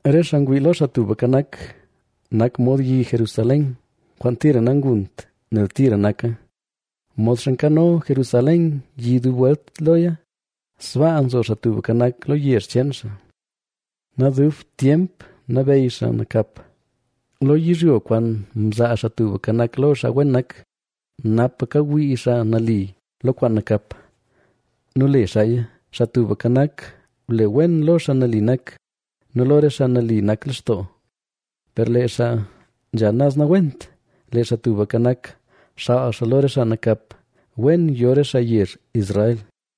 Re xaa ngwii lo Xaa Tubka Nak nak mod yi Jerusalén, kwaan tira nangunt, nel tira naka. Modxa nkano Jerusalén yi dub welt loya, sbaa nzo Xaa Tubka Nak, lo yezh cheen xaa. Nadubt tyemp nabeyy xaa nakap lo yizhyo kwaan mzaa Xaa Tubka Nak lo xaa wen nak, napa kawii xaa nali lo kwaan nakap nu le xaaya. Xaa Tubka Nak, ble wen lo xaa nali nak nu lo re xaa nali nak lextoo. Per lee xaa nzha naz nawent, lee Xaa Tubka Nak, xaal xaa lo re xaa nakap. Wen yo re xaa yezh Israel.